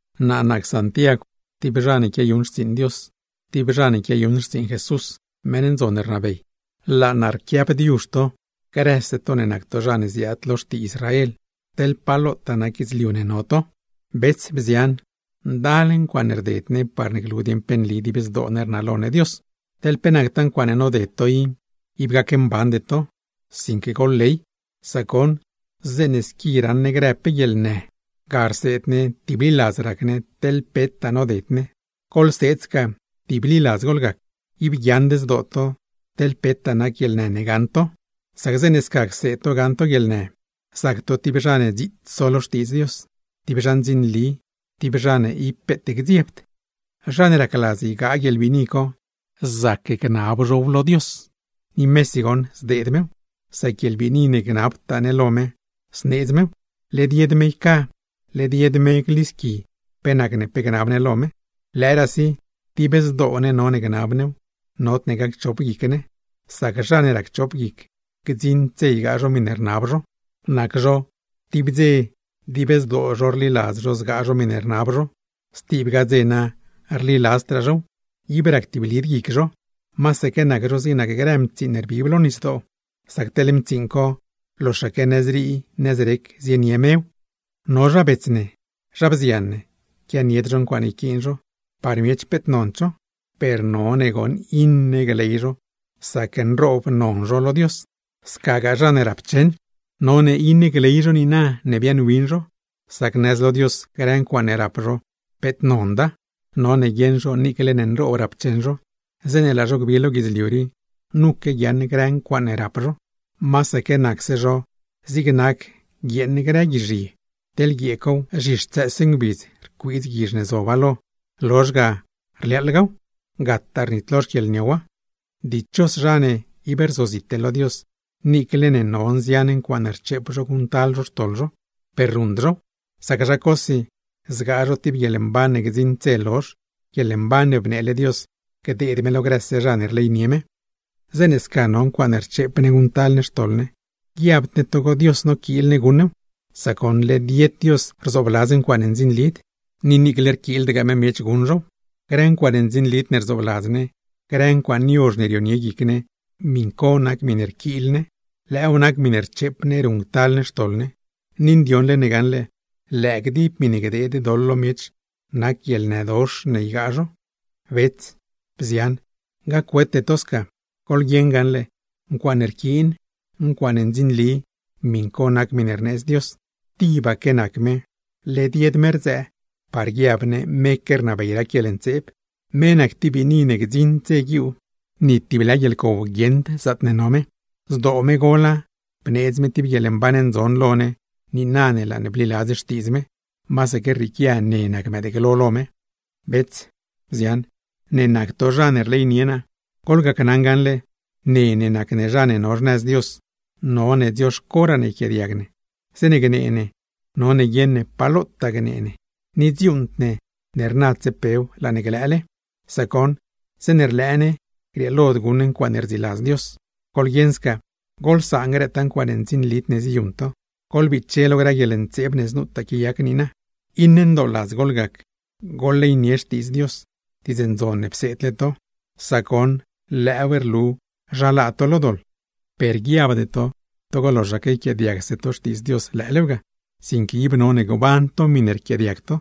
Naa nac Santiagw, tib zha ne quiayuṉ xtsiiṉ Dios, tib zha ne quiayuṉ xtsiiṉ Jesús, meṉ ndzon ne rnabey. Laa naa rquiaabdiuzh to grëse to ne nac to zha ne ziaad lo xtii Israel, teḻ pa lotaa nac guidzliu ne no to. Bets, bzian, ndal ncuaaṉe rded ne parne glu dieṉ pe nli dib zdoo ne rnalo ne Dios. Teḻ pe nactaa ncuaaṉe noded to i, ib gacmbande to, sinque goḻley. Sac goṉ, zeeṉe squi raṉ ne grë pe guieḻnë, ga rseed ne tibliladz rac ne teḻ petaa noded ne. Goḻseed sca tibliladz goḻgac. ¡Ib guiaaṉd zdoo to teḻ petaa nac guieḻnë ne gaṉ to! Sac zeeṉe sca cseed to gaṉ to guieḻnë, zac to tib zha ne dziits so lo Xtiidz Dios, tib zha ndzinli, tib zha ne ib peet gdziebd. Zha ne racladz ygaa guieḻbiini co, zac gnab zhow lo Dios, ni mesi goṉ zdeed mew; sac guieḻbiini ne gnabtaa ne lo me zneedz mew. Led yed me yca, led yed me glisqui pe nacne pe gnab ne lo me. Lëëraasi dib zdoo ne none gnab new, nodne gacchop guic ne; sac zha ne racchop guic, gdziṉd dze ygaa zho miṉe rnab zho. Nac zho, tib dze dib zdoo zho rliladz zho zgaa zho miṉe rnab zho, stibgaa dze na rliladzdraa zhow, ib ractiblid guic zho; masaque nac zho zig nac grë mtsiiṉ ne rbib lo nisdoo, sac teḻ mtsiiṉ co loxaque nëzrii nëzrec zienie mew. No zha bets ne, zha bzian ne, quianied zho ncuaaṉe yquiin zho, par miech peet nond zho; per none goṉ iṉe gley zho sac nroob non zho lo Dios. Scagaa zha ne rapcheṉ, none iṉe gley zho niina ne biaaṉwin zho, sac nëz lo Dios grë ncuaaṉe rap zho nonda. None guieṉ zho niicle ne nroob rapcheṉ zho, zeeṉe laa zho gbi lo guidzliu rii nuque guiaaṉ grë ncuaaṉe rap zho. Masaque nacse zho zig nac guieeṉ grë guizh ye, teḻ guiee cow, zhixtsëëse ngbidz rcuiidz guizh ne zoba lo, rlozh ga rliaaḻgaw, gataa rnitlo xquieḻniowa. Dichos zha ne ib rzozite lo Dios niicle no nzian ncuaaṉe rcheep zho guṉctal zho xtoḻ zho, per ruṉd zhow; sac zha cosi zgaa zho tib guieḻmban ne gdziṉd dze lozh, guieḻmban ne bneele Dios gdeed me lo grëse zha ne rleynie me. Zeeṉe sca no ncuaaṉe rcheep ne guṉctal ne xtoḻ ne, guiabd ne togo Dios noquiil ne guṉ new; sac goṉ led yed Dios rzoobladz ncuaaṉe ndzinlid, ni niicle rquiildgaa me miech guṉ zhow. Grë ncuaaṉe ndzinlid ne rzoobladz ne, grë ncuaaṉ yozh ne rionie guic ne, miṉ co nac miṉe rquiil ne. Lëëw nac miṉe rcheep ne ruṉctal ne xtoḻ ne, ni ndioṉle ne gaṉle, lëë gdib miṉe gdeed doḻ lo miech nac guieḻnëdox ne ygaa zho. Bets, bzian, gac-wete to sca. Goḻguieṉ gaṉle, ncuaaṉe rquiin, ncuaaṉe ndzinli, miṉ co nac miṉe rneedz Dios. Tibaque nac me, led yed me rdzëë par guiab ne meque rnabey rac guieḻntseeb. Me nac tib biini ne gdziṉd dze guiuu, ni tib lë guieḻcow guieṉd zaatne no me. Zdoo me gola bneedz me tib guieḻmban ndzon lo ne niina ne laa bliladz Xtiidz me, masaque rrieequia ne nac mëëdglo lo me. Bets, bzian, ne nac to zha ne rleynie naa: Goḻgacnaṉ gaṉle, ne ne nac ne zha ne no xnëz Dios, none dzioxcoraa ne yquiaadiag ne, zeeṉe gnee ne none guieṉ ne pa lotaa gnee ne, ni guṉd ne ne rnadse pew laa ne glëële. Sac goṉ, zeeṉe rlëë ne, grieelod guṉ ne ncuaaṉe rdziladz Dios. Goḻguieṉ sca, goḻsaan grëtaa ncuaaṉe ndzinlid ne ziyuṉ to, goḻbiche lo grë guieḻntseeb ne znutaa quiayac niina. Iṉe ndooladz goḻgac, goḻleynie Xtiidz Dios, diidz ndzon ne pseedle to; sac goṉ lëëw rlu zha laa to lo doḻ. Per guiabde to togo loxaque yquiaadiagse to Xtiidz Dios lëëlew ga; sinque ib none gban to miṉe rquiaadiag to,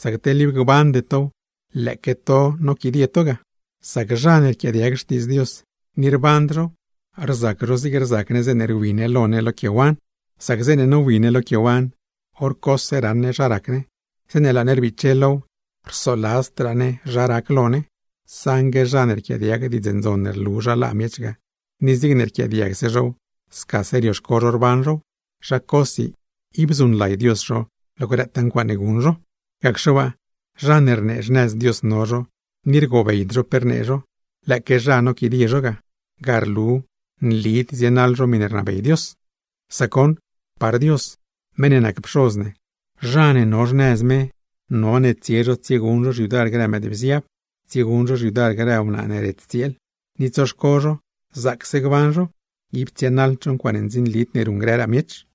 sac teḻ ib gbande tow lëëque to noquidie to ga. Sac zha ne rquiaadiag Xtiidz Dios, ni rband zhow, rzac zho zig rzac ne zeeṉe rwi ne lo ne lo quiewan: Sac zeeṉe nowi ne lo quiewan, hor cose raṉ ne zha rac ne; zeeṉe laa ne rbiche low rsoladzdraa ne zha rac lo ne. Saṉgue zha ne rquiaadiag Diidz Ndzon ne rlu zha laa miech ga, ni zigne rquiaadiagse zhow scasaque rioxco zho rban zhow, zha cosi ib zuṉlay Dios zho lo grëtaa ncuaaṉe guṉ zho. Gacxe waa, zha ne rnee xnëz Dios no zho ni rgobeyd zho pe rnee zho, lëëque zha noquidie zho ga, ga rlu nlid zienaḻ zho miṉe rnabey Dios. Sac goṉ, par Dios meṉ ne nac Pxoz ne, zha ne no xnëz me none tsie zho tsieguṉ zho xyudar grë mëëdbziab, tsieguṉ zho xyudar grë wnaa ne ret tsieel, ni tsoxco zho zaacse gban zho, ib tsienaḻd zho ncuaaṉe ndzinlid ne ruṉ grëraa miech.